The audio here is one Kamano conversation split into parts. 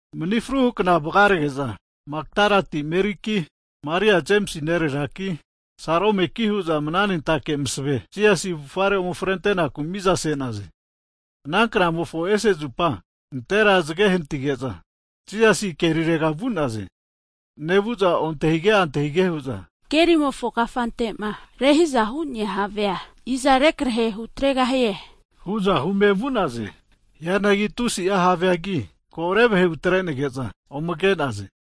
Mni fruhu kna (Sabat) vagarege'za Makdalati Meriki, Maria Jemisi nereraki, Salomeki hu'za mananentake masave Jisasi avufare ome frentenaku miza se'naze. Ana knamofo ese zupa (Sonta) nantera zge nehnatige'za, Jisasi kerirega vu'naze. Nevu'za ontahige antahige hu'za, kerimofo kafantema rehiza hu'nea havea iza rekrehe hutregahie, hu'za hume vu'naze. Hianagi tusi'a haveagi, ko revahe hutrenege'za ome ke'naze.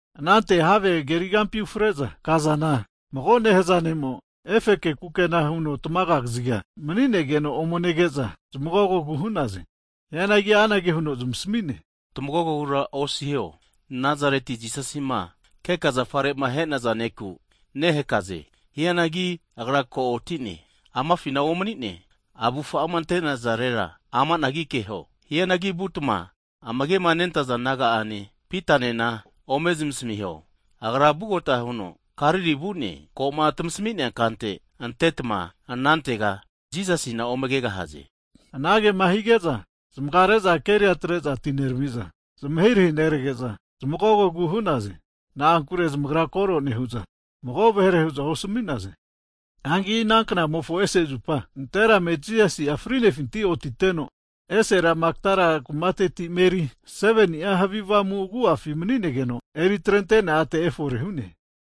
Anante have kerigampi ufre'za kazana, mago nehaza ne'mo efeke kukena huno tmaga'a kaziga mani'negeno ome nege'za zmagogogu hu'naze. Hianagi anage huno zmasami'ne tmagogogura osiho, Nazareti Jisasima keka zafarema ahe'naza ne'ku nehakaze. Hianagi Agra ko otine. Amafina omanine, avufa'ama ante'nazarera ami'nagi keho! Hianagi vutma amage'ma nentaza disaipol naga'ane, Pitanena ome zmasamiho, Agra vugota huno Galili vu'ne, koma tmasami'nea kante antetma anantega Jisasina ome kegahaze. Anagema hige'za zmagare'za keria atre'za atinerami'za, zmahirahi nerege'za zmagogogu hu'naze. Na'ankure zmagra koro nehu'za, mago vahere hu'za ozmasmi'naze. [Hagi ana knamofo ese zupa (Sonta), nanterame Jisasi'a fri'nefinti otiteno, esera Makdala kumate a' Meri, 7ni'a havi avamu agu'afi maninegeno eri atrente'nea ate efore hu'ne.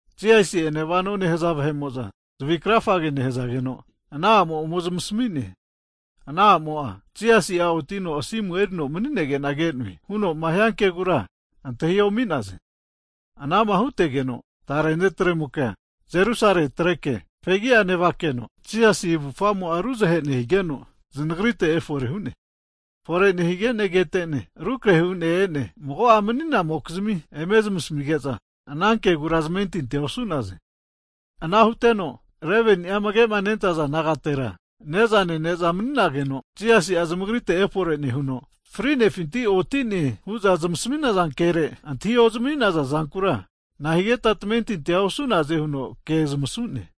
Jisasi'ene vano nehza vahe'mo'za zavi krafage nehazageno ana a'mo ome zmasmi'ne. Ana a'mo'a, Jisasi'a otino asimu erino maninege'na ke'noe hunoma hia kegura, antahi omi'naze. Ana'ma hutegeno tare ne'tremo'kea Jerusale atreke fegi'a nevakeno, Jisasi avufagamo'a ruzahe nehigeno znagrite efore hu'ne. Fore nehige'ne kete'ne rukrehe hu'ne e'ne, mago'a mani'namokizmi eme zmasamige'za, anankegura zamentinti osu'naze. Ana huteno 11ni'a amage'ma nentaza disaipol nagatera, ne'za nene'za maninageno, Jisasi'a zmagrite efore nehuno, frinefinti otine hu'za zmasaminaza kere antahi ozami'naza zankura, nahigeta tamentintia osu'naze huno ke zmasu'ne.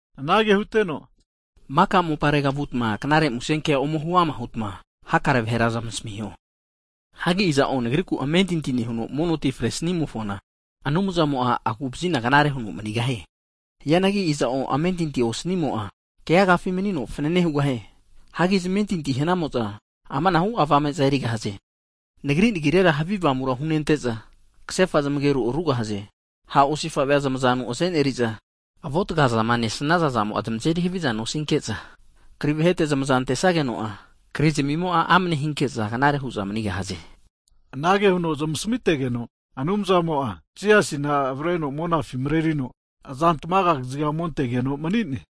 Anage huteno, maka moparega vutma knare musenkea ome huama hutma, hakare vahera zmasamiho. Hagi iza'o Nagriku amentinti nehuno, mono ti fre snimofona Anumzamo'a agu'vazina knare huno manigahie. Hianagi iza'o amentinti osanimo'a, keagafi manino fanana hugahie. Hagi zamentinti hanamo'za amanahu avame'za erigahaze. Nagri nagirera havi avamura hunente'za, kasefa zamageru arugahaze. Ha' osifa'vea zmazanu aze'neri'za, avuataga zama nesnaza'zamo'a zmazeri haviza nosinke'za, kri vahete zmazama antesageno'a, krizamimo'a amane hinke'za, knare hu'za manigahaze. Anage huno zamasmitegeno, Anumzamo'a Jisasina avareno monafi marerino, azantmaga kaziga ome antegeno mani'ne.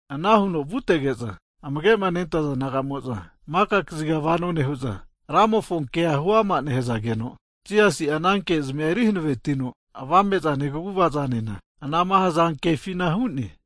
Ana huno vutege'za, amage'ma nentaza nagamo'za maka kaziga vano nehu'za, Ramofona kea huama nehazageno, Jisasi'a ana kezmia eri hanavetino avame'zane, kaguva'zanena anama hazankefina hu'ne.]